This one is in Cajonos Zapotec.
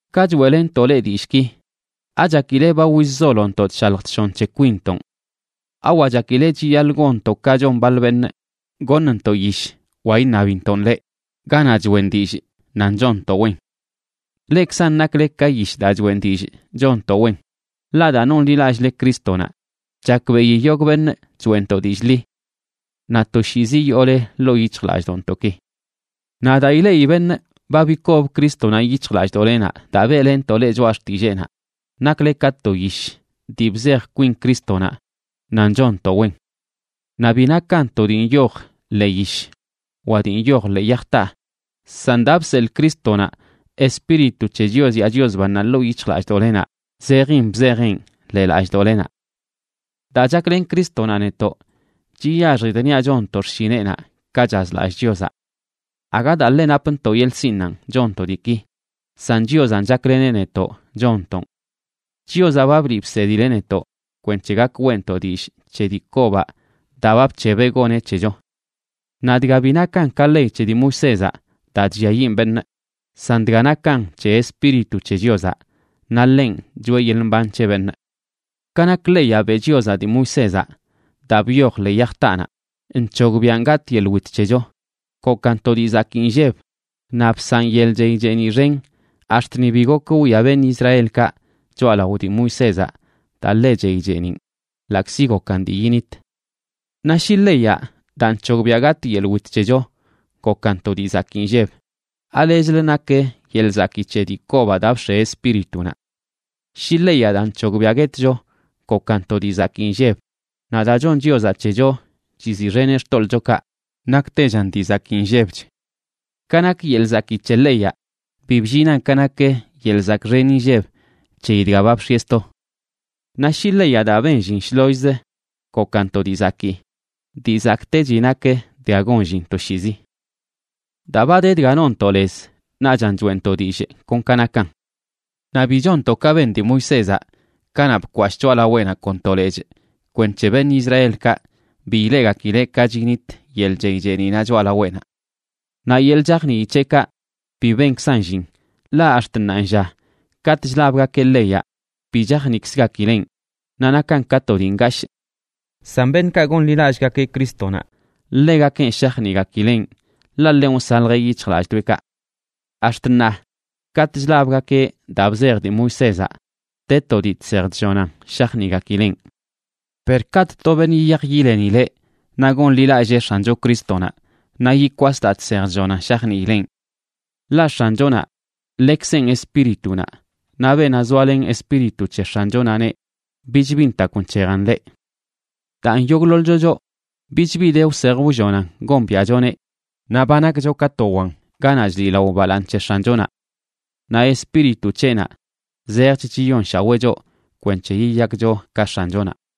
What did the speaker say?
Ka choeꞌlenntoꞌ leꞌ dillꞌki, ¿achakile ba wizzolontoꞌ chshalj chshon c̱he kwinntonꞌ? ¿Awa chakile chiyaḻꞌ gonntoꞌ ka chon baḻ beṉꞌ, goṉntoꞌ yish, wa iṉabintoꞌn leꞌ, ganaꞌ choꞌen dillꞌ nan chonntoꞌ wen? Leꞌkzan nakle ka yish daa choꞌen dillꞌ chonntoꞌ wen, ḻaꞌ daa nonḻilallꞌle Crístonaꞌ chakbeꞌi yogꞌ beṉꞌ choeꞌntoꞌ dillꞌ ḻi. Naꞌ toshiizi yoole ḻoo yic̱hjlallꞌdoꞌntoꞌki. Naꞌ daa ileꞌi beṉꞌ ba bikob Crístonaꞌ yic̱hjlallꞌdoꞌlenaꞌ daa beꞌlenntoꞌ leꞌ choꞌa xtilleenaꞌ, nakle ka to yish dii bzej kwin Crístonaꞌ nan chonntoꞌ wen. Naꞌ bi nakan to dii nyoj ḻee yish wa dii nyoj ḻee yaj taa, san daa ba bseḻꞌ Crístonaꞌ Espíritu c̱he Chios yaa Chios bannaꞌ ḻoo yic̱hjlallꞌdoꞌlenaꞌ zejin bzejeꞌn ḻee lallꞌdoꞌlenaꞌ. Daa chaklen Crístonaꞌ netoꞌ, chiyaxjidꞌ niaꞌ chonntoꞌ xshineꞌnaꞌ ka chazlallꞌ Chiozaꞌ. Aga daa ḻe napntoꞌ yeḻꞌ sinꞌnanꞌ chonntoꞌ diiki, san Chiozanꞌ chakleneꞌ netoꞌ chonntoꞌn. Chiozaꞌ ba bliꞌ bsedileꞌ netoꞌ kwenc̱he gak weꞌntoꞌ dillꞌ c̱he dii kobaꞌ daa ba bc̱hebeꞌ goneꞌ c̱hecho. Naꞌ dga bi nakan ka ley c̱he dii Moisézaꞌ daa chlliayiꞌn beṉꞌ, san dga nakan c̱he Espíritu c̱he Chiozaꞌ, naꞌ ḻenꞌ choꞌe yeḻꞌ mban c̱he beṉꞌ. Ka nak leyaꞌ beꞌ Chiozaꞌ dii Moisézaꞌ, daa byoj ḻee yaj taanaꞌ, nc̱hogbiaꞌn gatꞌ yeḻꞌ wit c̱hecho, gokan to dii zakii nlleb naꞌ bsaꞌn yeḻꞌ chey cheeniꞌ xen ax̱t ni bi gok wwia beṉꞌ Israelkaꞌ choꞌalao dii Moisézaꞌ daa ḻe chey cheeniꞌn ḻaꞌkzi gokan dii yinit. Naꞌ shi leyaꞌ daa nc̱hogbiꞌa gatꞌ yeḻꞌ wit c̱hecho gokan to dii zakii nlleb, ¿alechlə nak yeḻꞌ zakii c̱he dii kobaꞌ daa bx̱e Espíritunaꞌ? Shi leyaꞌ daa nc̱hogbiꞌa guetcho gokan to dii zakii nlleb, naꞌ daa chon Chiozaꞌ c̱hecho chiziꞌxeneꞌ xtoḻꞌchokaꞌ, naktechan dii zakii nllebch. Ka nak yeḻꞌ zakii c̱he leyaꞌ, bi bllinan ka nak yeḻꞌ zakꞌ xen inlleb c̱heyi dga ba bx̱ieꞌ sto. Naꞌ shi leyaꞌ daa ben llin shlollz gokan to dii zakii, dii zakꞌtechi nak dga gon llin toshiizi. Daa ba de dga nonntoꞌ lez naꞌchan choeꞌntoꞌ dillꞌ kon ka nakan. Naꞌ bi chonntoꞌ ka ben dii Moisézaꞌ kanaꞌ bkwashꞌ choꞌalaweꞌnaꞌ kon to lechꞌ kwenc̱he beṉꞌ Israelkaꞌ bi ileꞌgakileꞌ ka chinit yeḻꞌ chey cheeniꞌnaꞌ choꞌalaweꞌnaꞌ. Naꞌ yeḻꞌ chajnii c̱heꞌkaꞌ bi benkzan llin, ḻaꞌ ax̱t ṉaanlla katꞌ chlabgakeꞌ leyaꞌ bi chajniꞌkzgakileꞌn naꞌ nakan ka to dii ngashꞌ. San beṉꞌkaꞌ gonḻilallꞌgakeꞌ Crístonaꞌ, ḻegakenꞌ shajniꞌgakileꞌn, ḻaꞌ ḻenꞌ wsaljeꞌ yic̱hjlalldoeꞌkaꞌ. Ax̱t ṉaa, katꞌ chlabgakeꞌ daa bzej dii Moisézaꞌ, de to dii chsej chllonan shajniꞌgakileꞌn. Per katꞌ to beṉꞌ yiyaj yilenileꞌ naꞌ gonḻilallee X̱ancho Crístonaꞌ, naꞌ yikwas daa chsej chllonan shajniileꞌn. Ḻaꞌ X̱anchonaꞌ, ḻekzenꞌ Espíritunaꞌ, naꞌ beenaꞌ zoalen Espíritu c̱he X̱anchonaꞌneꞌ, bich bi ntakw nc̱hejan ḻeꞌ. Daan, yogꞌḻoḻcho choꞌ bich bi de wsej wllonan gombiaꞌchoneꞌ, naꞌ ba nakcho ka to wan ganaꞌ chliꞌlao balaaṉ c̱he X̱anchonaꞌ. Naꞌ Espíritu c̱heꞌnaꞌ zejch chiyonshaweꞌ choꞌ kwenc̱he yiyakcho ka X̱anchonaꞌ.